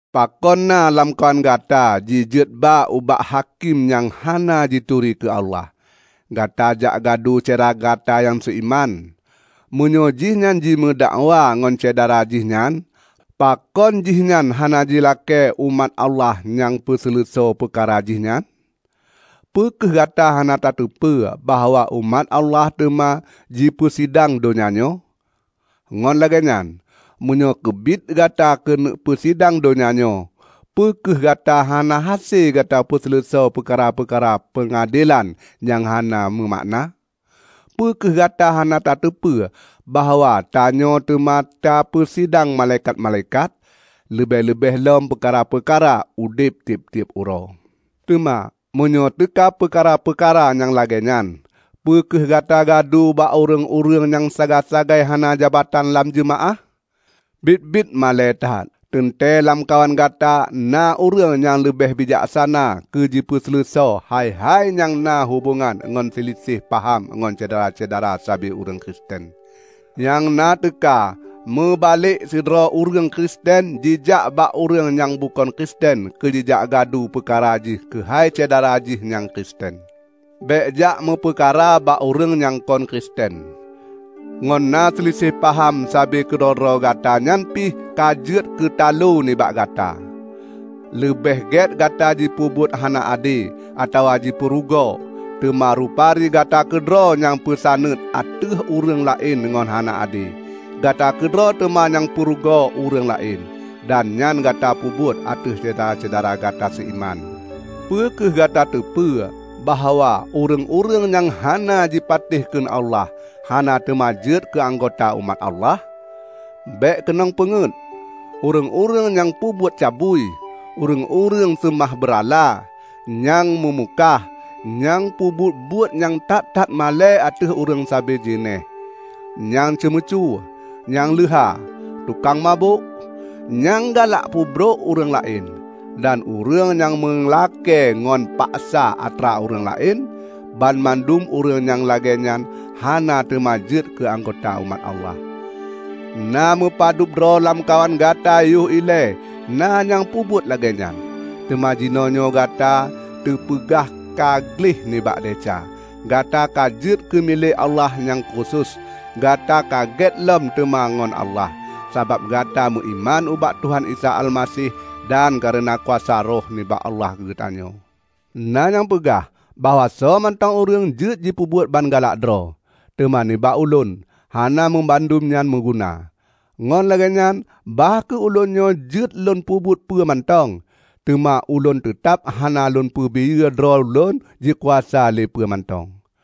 Pakon na lamkawan gata jijeuet ba ubak hakém nyang hana jituri keu Allah, gata jakgadu syedara gata nyang seuiman, meunyoe jihnyan jimeudakwa ngon syedara jih nyan? Pakon jihnyan hana jilakée umat Allah nyang peuseuleusoe peukara jih nyan? Peu kheueh gata hana tateupeue bahwa umat Allah teuma jipeusidang donya nyoe? Ngon lagée nyan, meunyoe keubiet gata keuneuk peusidang donya nyoe, peu kheueh gata hana hase gata peuseuleusoe peukara-peukara peungadelan nyang hana meumakna? Peu kheueh gata hana tateupeue bahwa tanyoe teuma tapeusidang malaikat-malaikat? Leubeh-leubeh lom peukara-peukara udeb tieb-tieb uroe! Teuma meunyoe teuka peukara-peukara nyang lagée nyan, peu kheueh gata gadu bak ureuëng-ureuëng nyang sagai-sagai hana jabatan lam jeumaáh? Biet-biet malée that! Teuntée lamkawan gata na ureuëng nyang leubeh bijaksana keu jipeuseuleusoe hai-hai nyang na hubongan ngon seuliseh paham ngon syedara-syedara sabe ureuëng Kristen! Nyang na teuka meubalek sidroe ureuëng Kristen jijak bak ureuëng nyang bukon Kristen keu jijak gadu peukara jih keuhai syedara jih nyang Kristen! Bék jak meupeukara bak ureuëng nyang kon Kristen; ngon na seuliseh paham sabe keudroe-droe gata nyan pih ka jeuet keutalo nibak gata. Leubeh gét gata jipeubuet hana ade, atawa jipeurugoe! Teuma rupari gata keudroe nyang peusaneut ateueh ureuëng laén ngon hana ade. Gata keudroe teuma nyang peurugoe ureuëng laén. Dan nyan gata peubuet ateueh syedara-syedara gata seuiman! Peu kheueh gata teupeu bahwa ureuëng-ureuëng nyang hana jipatéh kheun Allah, hana teuma jeuet keu anggota umat Allah? Bék keunong peungeuet! Ureuëng-ureuëng nyang peubuet cabui, ureuëng-ureuëng seumah beurala, nyang meumukah, nyang peubuet-buet nyang that-that malée ateueh ureuëng sabe jeunéh, nyang ceumeucue, nyang leuha, tukang mabök, nyang galak peubrok ureuëng laén, dan ureuëng nyang meulakée ngon paksa atra ureuëng laén -- banmandum ureuëng nyang lagée nyan hana teuma jeuet keuanggota umat Allah. Na meupadub droe lamkawan gata yoh ilée na nyang peubuet lagée nyan. Teuma jinoenyoe gata teupeugah ka gleh nibak desya. Gata ka jeuet keu milék Allah nyang khusos. Gata ka gét lom teuma ngon Allah, sabab gata meuiman ubak Tuhan Isa Almaseh dan kareuna kuasa Roh nibak Allah geutanyoe. Na nyang peugah bahwa soemantong ureuëng jeuet jipeubuet ban galak droe. Teuma nibak ulôn hana banmandum nyan meuguna. Ngon lagée nyan bah kheueh ulôn nyoe jeuet lôn peubuet peue mantong, teuma ulôn teutab hana lôn peubiyeu droe ulôn jikuasa lé peue mantong.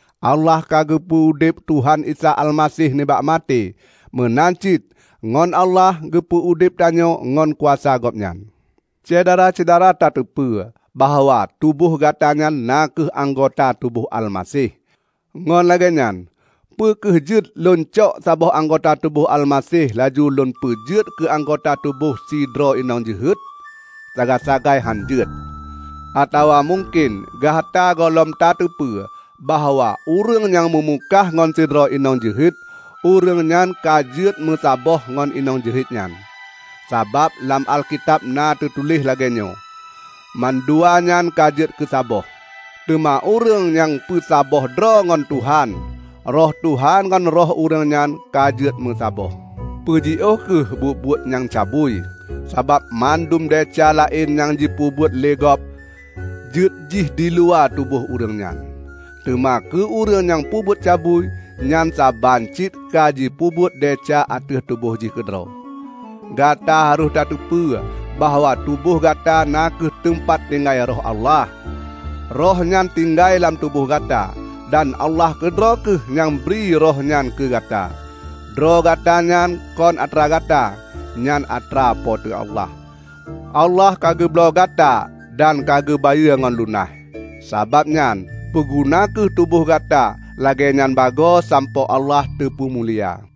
Allah ka geupeu udeb Tuhan Isa Almaseh nibak maté, meunan cit ngon Allah geupeu udeb tanyoe ngon kuasa Gobnyan. Syedara-syedara tateupeue bahwa tuboh gata nyan na kheueh anggota tuboh Almaseh. Ngon lagée nyan, peu kheueh jeuet lôncok saboh anggota tuboh Almaseh laju lôn peujeuet keuanggota tuboh sidroe inong jeuhet? Sagai-sagai hán jeuet! Atawa mungken gata gohlom tateupeue bahwa ureuëng nyang meumukah ngon sidroe inong jeuhet, ureuëng nyan ka jeuet meusaboh ngon inong jeuhet nyan! Sabab lam Alkitab na teutuléh lagée nyan, "Manduanyan ka jeuet keusaboh." Teuma ureuëng nyang peusaboh droe ngon Tuhan, Roh Tuhan ngon roh ureuëng nyan ka jeuet meusaboh. Peujiôh kheueh buet-buet nyang cabui. Sabab mandum desya laén nyang jipeubuet lé gob, jeuetjih diluwa tuboh ureuëng nyan. Teuma keu ureuëng nyang peubuet cabui, nyan saban cit ka jipeubuet desya ateueh tuboh jih keudroe. Gata harôh tateupeue bahwa tuboh gata na kheueh teumpat tinggai Roh Allah. Rohnyan tinggai lam tuboh gata. Dan Allah keudroe kheueh nyang bri Roh nyan keu gata. Droe Gata nyan kon atra gata. Nyan atra Po teu Allah. Allah ka geubloe gata dan ka geubayeue ngon lunaih. Sabab nyan, peuguna kheueh tuboh gata lagée nyan bagoe sampoe Allah teupeumulia.